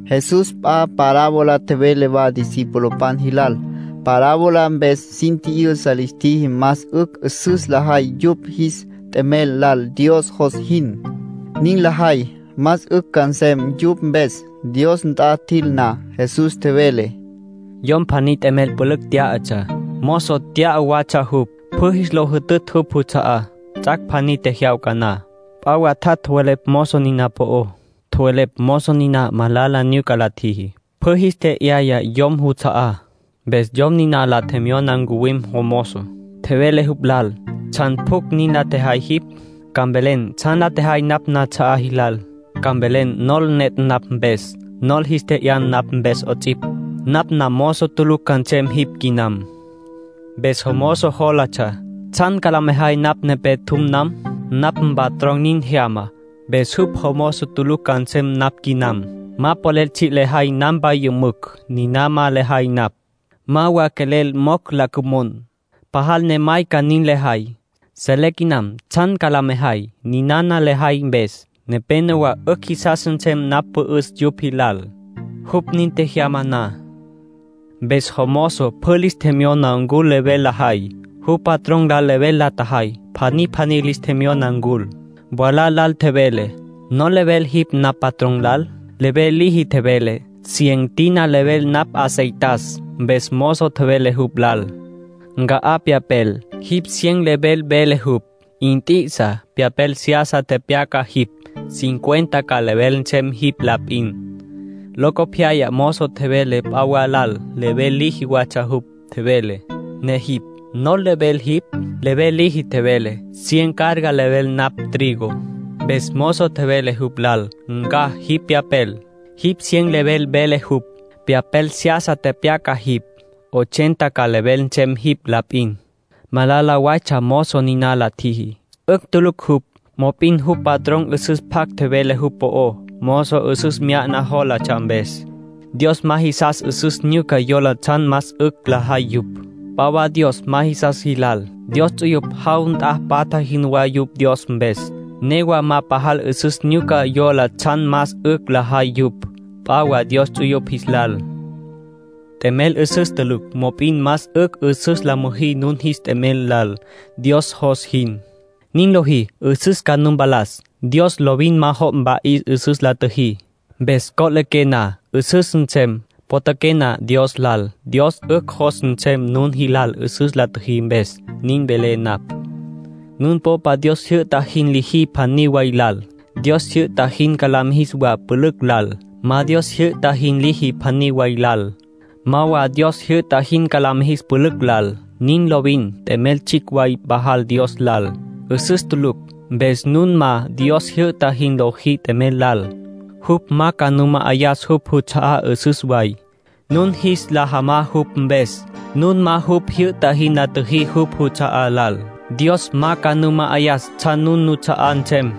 Jesús p'a parábola tjevele wa discipulopan jilal. Parábola mpes sin tji'yüsa lis tjiji más 'ücj 'üsüs lajay yupj jis t'emel lal Dios jos jin. Nin lajay, más 'ücj ca nsem yupj mpes, Dios nt'a jil na. Jesús tjevele: “Yom pjaní t'emel pülücj tyá'atsja, mozo tya'a watsja jupj, pjü jis lo jütütj jupj juts'a'á. Ts'ac' pjaní tjejyawca na, p'a wa tjat' tjowelepj mozo niná po'ó. Tjowelepj mozo niná malala nyuca la tjiji, pjü jis tje'yaya yom juts'a'á. Mpes yom niná la tjemyona ncuwim jomozo, tjevele jupj lal: ‘¿Tsjan pjucj nin la tjejay jipj? Ca mvelen tsjan la tjejay napj nats'a'á jilal. Ca mvelen nol netj napj mpes, nol jis tje'yan napj mpes 'ots'ipj. Napj namozo tulucj ca nsem jipj quinam.’ ”Mpes jomozo jólatsja: ‘¿Tsjan ca la mejay napj quepé tjum nam? Napj mpatrón nin jyama, mpes jupj jomozo tulucj ca nsem napj quinam. Ma polel tsji' lejay nampa yümücj. Niná ma lejay napj. Ma wa quelel mocj la cümon. Pajal ne mayca nin lejay. Selé quinam tsjan ca la mejay. Ninana lejay mpes, nepénowa 'ücj jisas nsem napj pü'üs yupj jilal, jupj nin tjejyama na.’ ”Mpes jomozo pjü lis tjemyona ncul level lajay, jupj patrón lal level la tjajay. Pjaní pjaní lis tjemyona ncul. Mwalá lal tjevele: ‘¿Nol level jipj napj mpatrón lal?’ Level liji tjevele: ‘Cien tina level napj aceitas’. Mpes mozo tjevele jupj lal: ‘Nca' pyapel, jipj cien level vele jupj. Nt'i'isa, pyapel seyasa tepyaca jipj, cincuenta ca level nsem jipj la p'in.’ Locopyaya mozo tjevele p'a wa lal, level liji watsja jupj. Tjevele: ‘Ne jipj ¿nol level jipj?’ Level liji tjevele: ‘Cien carga level napj trigo’. Mpes mozo tjevele jupj lal: ‘Nca' jipj pyapel, jipj cien level vele jupj. Pyapel seyasa tepyaca jipj, ochenta ca level nsem jipj la p'in.’ ”Malala waytsja mozo nin la tjiji. 'Ücj tulucj jupj, mop'in jupj patrón 'üsüs pjac tjevele jupj po'ó, mozo 'üsüs nyuca jólatsja mpes. Dios ma jisas 'üsüs nyuca yola tsjan más 'ücj lajay yupj, p'a wa Dios ma jisas jilal. Dios ts'uyupj jaw nt'a patja jinwá yupj Dios mpes, newa ma pajal 'üsüs nyuca yola tsjan más 'ücj lajay yupj, p'a wa Dios ts'uyupj jis lal. ”T'emel 'üsüs tulucj, mop'in más 'ücj 'üsüs la müjí nun jis t'emel lal, Dios jos jin. Nin lojí, 'üsüs ca nu mpalas. Dios lovin ma jo' mpa'is 'üsüs la tjüjí. Mpes co'liqué na, 'üsüs nsem. Potjaqué na Dios lal, Dios 'ücj jos nsem nun jilal 'üsüs la tjüjí mpes. Nin velé napj. ”Nun popa Dios jyü'ta jin liji pjaní way lal, Dios jyü'ta jin ca la mijis wa pülücj lal. Ma Dios tjijyü'ta jin liji pjaní way lal, ma wa Dios jyü'ta jin ca la mijis pülücj lal. Nin lovin. T'emel tsjicj way pajal Dios lal. 'Üsüs tulucj. Mpes nun ma Dios jyü'ta jin lojí t'emel lal, jupj ma ca nu ma'ayas jupj juts'a'á 'üsüs way, nun jis la jamas jupj mpes. Nun ma jupj tjijyü'ta jin la tjüjí jupj juts'a'á lal, Dios ma ca nu ma'ayas tsjan nun nuts'a'á nsem.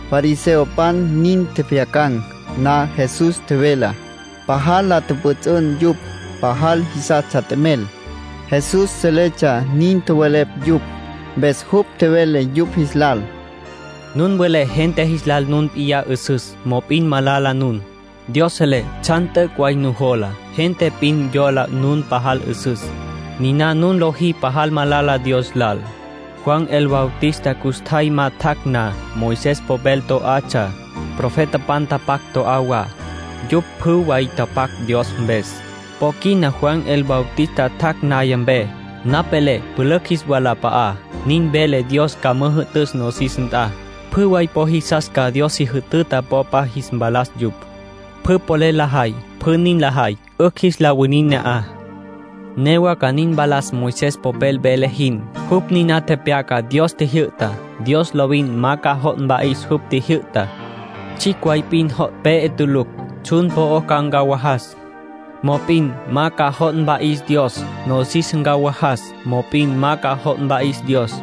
Fariseopan nin tjepjyacan̈ na Jesús tjevelá, pajal la tjüpjüts'ün. Yupj pajal jisastsja t'emel. Jesús seletsja nin tjowelepj yupj, mpes jupj tjevele yupj jis lal: “Nun welé gente jis lal nun p'iyá 'üsüs; mop'in malala nun. Dios selé tsjan t'üc' way nujola. Gente p'in yola nun pajal 'üsüs. Niná nun lojí pajal malala Dios lal. ”Juan el Bautista custjay ma tjac' na, Moisés popel to'atsja, profetapan tapac to'atsja wa. (Yupj pjü way tapac Dios mpes.) Po quina Juan el Bautista tjac' naya mpe, napj velé pülücj jis walap'a'á. Nin velé Dios ca müjü'tüs nosis nt'a. Pjü way po jisas ca Dios si jütüta popa jis mpalas yupj. Pjü polel lajay, pjü nin lajay, 'ücj jis la winin ne'aj. ”Newa ca nin mpalas Moisés popel vele jin, jupj niná tepyaca Dios tjijyü'tá. Dios lovin ma ca jo' mpa'is jupj tjijyü'tá. Tsjicj way p'in jo' pe'e tulucj. Tsjun po'ó ca ncawajas; mop'in ma ca jo' mpa'is Dios. Nosis ca ncawajas; mop'in ma ca jo' mpa'is Dios.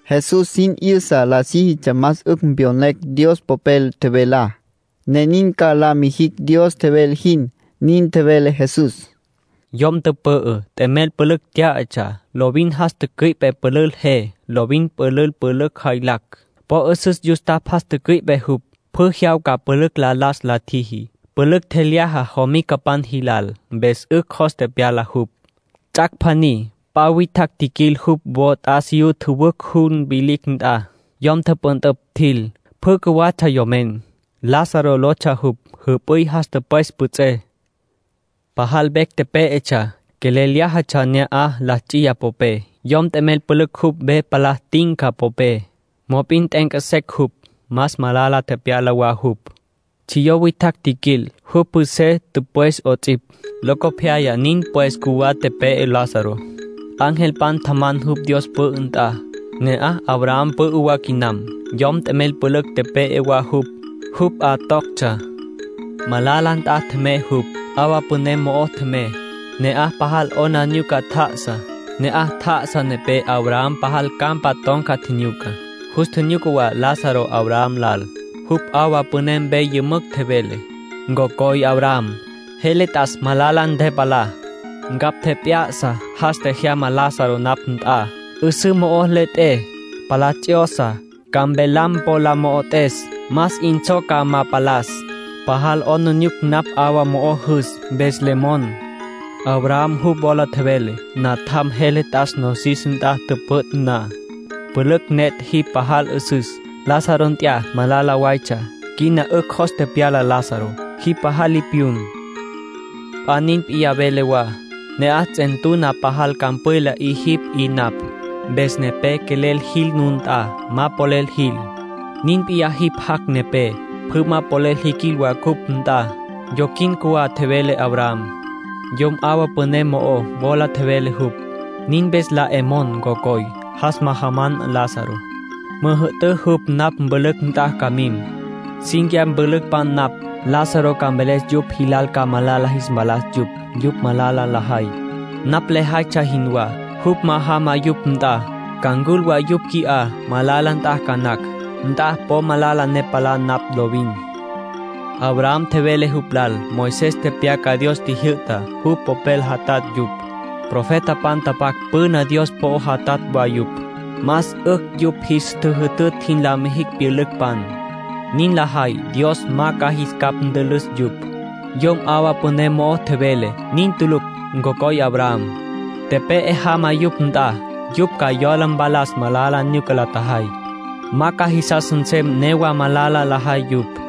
(Jesús sin 'yüsa la síjitsja más 'ücj pyonecj Dios Popel tjevelá, ne nin ca la mijicj Dios tjevele jin.) Nin tjevele Jesús: “Yom tüpü'ü, t'emel pülücj tyá'atsja. Lovin jas tücüi'pe pülül je. Lovin pülül pülücj jaylacj, po 'üsüs yustapj jas tücüi'pe jupj. Pjü jyawca pülücj la las la tjiji, pülücj tjelyaja jomicapan jilal, mpes 'ücj jos tepyala jupj. Ts'ac' pjaní p'a witjacj tjiquil jupj wo t'asiyú tjüwücj jun vilicj nt'a, yom tüpüntüpj, tjil. Pjü cjuwatsja yomen. Lázaro lotsja jupj. Jüp'üy jas tüpwes püts'ey. Pajal vecj pé'etsja. Quelel lyájatsja na'aj la ts'iya popé, yom t'emel pülücj jupj ve palá tinca popé. Mop'in t'e'enca secj jupj. Más malala tepyala wa jupj. Tsjiyó witjacj tjiquil, jupj püts'ey tüpwis 'ots'ipj. ”Locopyaya nin pues cjuwá tepe'e Lázaro. Angelpan tjaman jupj Dios pü'ü nt'a. Ne'aj Abraham pü'ü wa quinam. Yomen t'emel pülücj, tepe'e wa jupj, jupj 'a toctsja. Malala nt'a tjemey jupj, 'awa püné mo'o tjemey. Ne'aj pajal 'aplijila tjá'asa. Ne'aj tjá'asa nepé Abraham pajal campa ton̈ca tjinyuca. Jus tjinyuca wa Lázaro Abraham lal. Jupj 'awa püné mpe yümücj tjevele: ‘Ncocoy Abraham, jele t'as malala ntepalá. Ncapj tjep'ya'sa. Jas tjejyama Lázaro napj nt'a, 'üsǘ mo'o le 'et'é, palá ts'yosa, ca mpelam po la mo'ot'es, más 'in tsjo ca ma palas. Pasal 'aplijila napj 'awa mo'o jüs, mpes le mon.’ ”Abraham jupj wola tjevele: ‘Natjam, jele t'as nosis nt'a tüpüt' na, pülücj netj jipj pajal 'üsüs. Lázaro nt'ya malala waytsja. Quina 'ücj jos tepyala Lázaro; jipj pajal li piyun. P'a nin p'iyá velé wa: ne'aj ts'entuna pajal campwila 'i jipj 'i napj. Mpes quepé quelel jil nun nt'a, ma polel jil. Nin p'iyá jipj jac' nepé, pjü ma polel jiquil wa cupj nt'a. Yoquin cjuwá’, tjevele Abraham. ”Yom 'awa püné mo'ó, wola tjevele jupj: ‘Nin mpes la 'e mon, ncocoy, jas majaman Lázaro, müjü'tün jupj napj mpülücpan nt'a ca mim. Cínquiya mpülücpan napj. Lázaro ca mveles yupj jilal ca malala jis mpalas yupj, yupj malala lajay, napj lejaytsja jinwá. Jupj ma jama yupj nt'a, ca ncul wa yupj qui'á, malala nt'a, ca nacj. Nt'a po malala ne palá napj lovin.’ ”Abraham tjevele jupj lal: ‘Moisés tepyaca Dios tjijyü'tá. Jupj Popel jatatj yupj. Profetapan tapac püná Dios po'ó jatatj wa yupj. Más 'ücj yupj jis tjüjütütj jin la mijicj pyülücpan. Nin lajay, Dios ma ca jis capj ntülüs yupj.’ ”Yom 'awa püné mo'ó tjevele: ‘Nin tulucj, ncocoy Abraham. Tepe'e jama yupj nt'a, yupj ca yola mpalas malala nyuca la tjajay. Ma ca jisas nsem newa malala lajay yupj.’